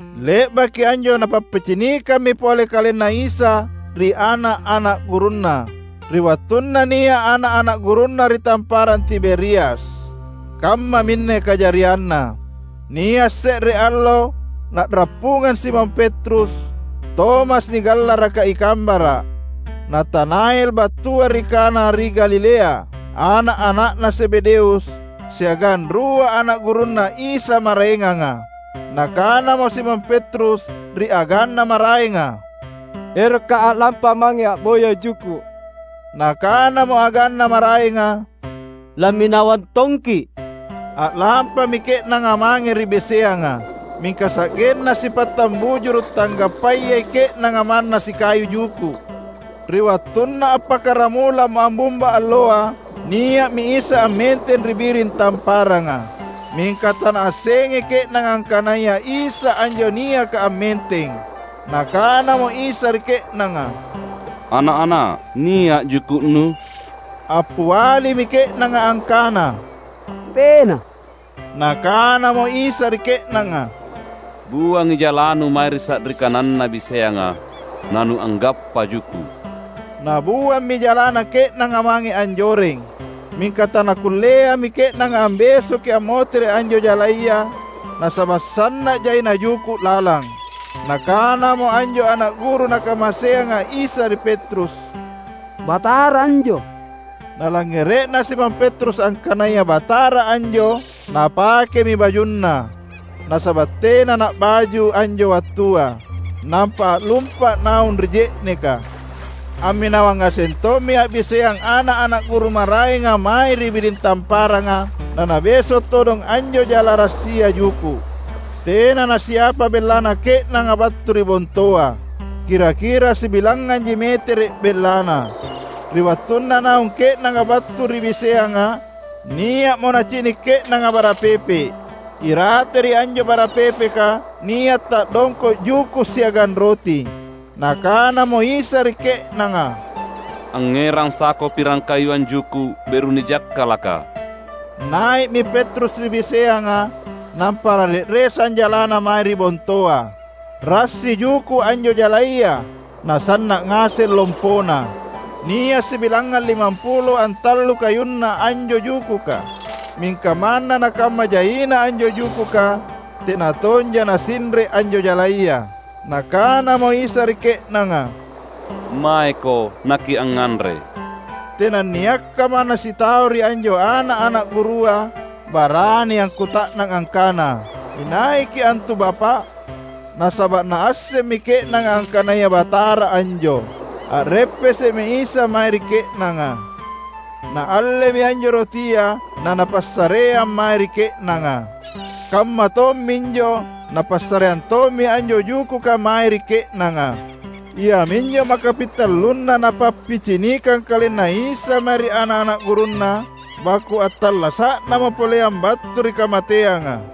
Le’baki anjo Napappicinikammi pole KalenNa Isa ri ana’-ana’ gurunNa, ri wattunna nia’ ana’-ana’ gurunNa ri Tamparang Tiberias. Kammaminne kajarianna: Nia’ se’re allo na’rappungang Simon Petrus, Tomas nigallaraka i Kambara’, Natanael battua ri Kana ri Galilea, ana’-ana’na Zebedeus, siagang rua ana’ gurunNa Isa maraenganga. Nakanamo Simon Petrus ri aganna maraenga, "Erokka’ a’lampa mange a’boya juku’." Nakanamo aganna maraenga, "Lamminawang tongki’." A’lampami ke’nanga mange ri biseanga. Mingka sa’genna sipattang bujuru’ tanggappayai ke’nanga manna sikayu juku’. Ri wattunna appakkaramulamo ammumba alloa, nia’mi Isa ammenteng ri biring tamparanga. Mingka tanaassengai ke’nanga angkanaya Isa anjo niaka ammenteng. Nakanamo Isa ri ke’nanga, "Ana’-ana’, nia’ juku’nu?" Appialimi ke’nanga angkana, "Tena." Nakanamo Isa ri ke’nanga, "Buangi jalanu mae ri sa’ri kananna biseanga, nanuanggappa juku’." Nabuammi jalana ke’nanga mange anjoreng. Mingka tanakulleami ke’nanga ambesoki ammotere’ anjo jalaya, nasaba’ sanna’ jaina juku’ lalang. Nakanamo anjo ana’ guru Nakamaseanga Isa ri Petrus, "Batara anjo!" Nalangngere’na Simon Petrus angkanaya Batara anjo, napakemi bajunna (nasaba’ tena na’baju anjo wattua) nampa a’lumpa’ naung ri je’neka. Amminawang ngaseng tommi a’biseang ana’-ana’ guru maraenga mae ri biring tamparanga, nanabeso’ todong anjo jala rassia juku’. Tena nasiapa bellana ke’nanga battu ri bontoa. Kira-kira sibilangnganji metere’ bellana. Ri wattunna naung ke’nanga battu ri biseanga, nia’mo nacini’ ke’nanga bara pepe’. Irate ri anjo bara pepeka nia’ ta’dongko’ juku’ siagang roti. Nakanamo Isa ri ke’nanga, "Angngerang sako pirang kayuang juku’ beru nijakkalaka." Nai’mi Petrus ri biseanga, nampa nare’resang jalana mae ri bontoa. Rassi juku’ anjo jalaya, nasanna’ ngaseng lompona. Nia’ sibilangngang limampulo antallu kayunna anjo jukuka. Mingka manna nakamma jaina anjo jukuka, tena tonja nasinre’ anjo jalaya. Nakanamo Isa ri ke’nanga, "Maeko nakiangnganre." Tenanniakka manna sitau ri anjo ana’-ana’ gurua barani akkuta’nang angkana, "InaiKi’ antu Bapa’?" Nasaba’ naassemmi ke’nanga angkanaya Batara anjo. A’reppese’mi Isa mae ri ke’nanga. Naallemi anjo rotia naNapassareang mae ri ke’nanga. Kamma tomminjo, Napassareang tommi anjo jukuka mae ri ke’nanga. Iaminjo maka pintallunna Napappicinikang KalenNa Isa mae ri ana’-ana’ gurunNa baku’ attallasa’namo poleang battu ri kamateanga.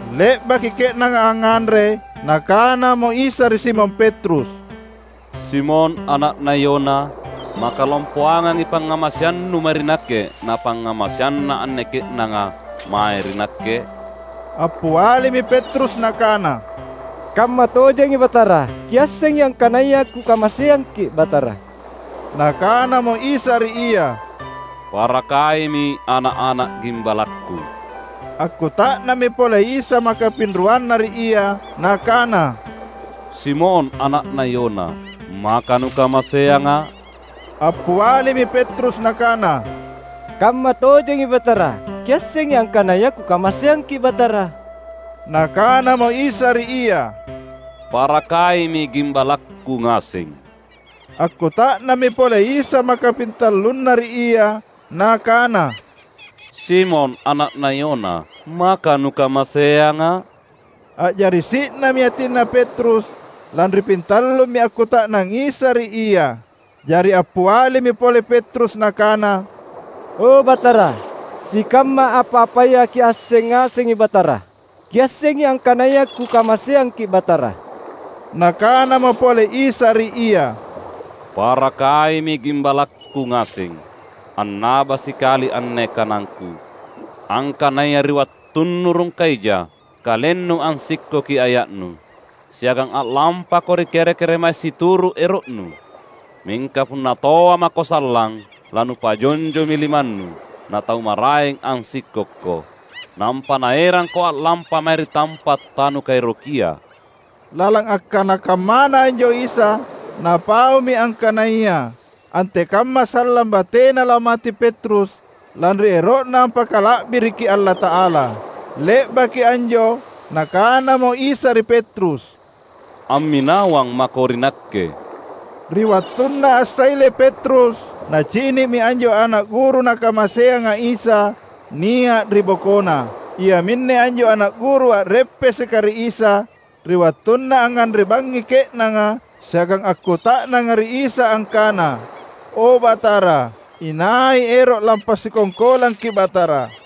Le’baki ke’nanga angnganre, Nakanamo Isa ri Simon Petrus, "Simon, ana’na Yona, maka lompoangangi pangngamaseannu mae ri Nakke na pangngamaseanna anne ke’nanga mae ri Nakke?" Appialimi Petrus nakana, "Kammatojengi Batara, Kiassengi angkanaya kukamaseangKi’ Batara." Nakanamo Isa ri ia, "Parakaimi ana’-ana’ gimbalakKu." Akkuta’nammi pole Isa maka pinruanna ri ia, Nakana, "Simon, ana’na Yona, maka nukamaseangA’?" Appialimi Petrus nakana, "Kammatojengi Batara, Kiassengi angkanaya kukamaseangKi’ Batara." Nakanamo Isa ri ia, "Parakaimi gimbalakKu ngaseng." Akkuta’nammi pole Isa makapintallunna ri ia, Nakana, "Simon, ana’na Yona, maka nukamaseangA’?" A’jari si’nami atinna Petrus, lanri pintallummi akkuta’nang Isa ri ia. Jari appialimi pole Petrus nakana, "O Batara, sikamma apa-apaya Kiasseng ngasengi Batara. Kiassengi angkanaya kukamaseangKi’ Batara!" Nakanamo pole Isa ri ia, "Parakaimi gimbalakKu ngaseng. Annaba sikali anne kanangKu: Angkanaya ri wattunnu rungka ija, kalennu ansikkoki aya’nu, siagang a’lampako ri kere-keremae situru’ ero’nu. Mingka punna toa mako sallang, lanupajonjomi limannu, na tau maraeng ansikkokko, nampa naerangko a’lampa mae ri tampa’ tanukaerokia." (Lalang akkana kammana anjo Isa, Napaumi angkanaya antekamma sallang batena lamate Petrus lanri ero’na ampakala’biriki Allata’ala.) Le’baki anjo, Nakanamo Isa ri Petrus, "Amminawang mako ri Nakke!" Ri wattunna assaile Petrus, nacini’mi anjo ana’ guru Nakamaseanga Isa nia’ ri bokona. (Iaminne anjo ana’ guru a’reppeseka ri Isa ri wattunna angnganre bangngi ke’nanga siagang akkuta’nanga ri Isa angkana, "O Batara inai ero’ lampasikongkolangKi’ Batara?")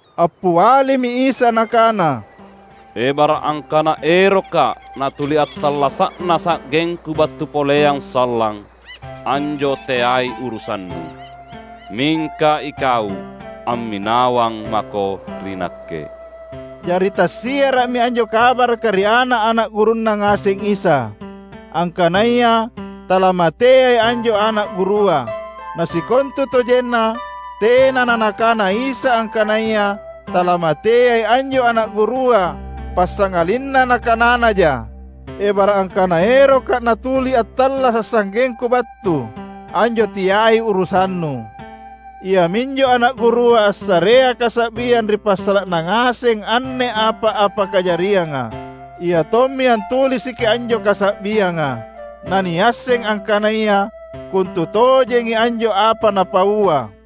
Appialimi Isa Nakana, "Ebara’ angkana erokKa’ natuli attallasa’na sa’gengKu battu poleang sallang, anjo teai urusannu. Mingka ikau, amminawang mako ri Nakke!" Jari tassiara’mi anjo kabaraka ri ana’-ana’ gurunNa ngaseng Isa, angkanaya talamateai anjo ana’ gurua. Na sikontutojenna tena na Nakana Isa angkanaya talamateai anjo ana’ gurua passangalinna Nakananaja: "Ebara’ angkana erokKa’ natuli attallasa’ sa’gengKu battu, anjo teai urusannu." Iaminjo ana’ gurua assarea kasa’biang ri passala’na ngaseng anne apa-apa kajarianga. Iatommi antulisiki anjo kasa’bianga. Na niasseng angkanaya kontutojengi anjo apa napaua.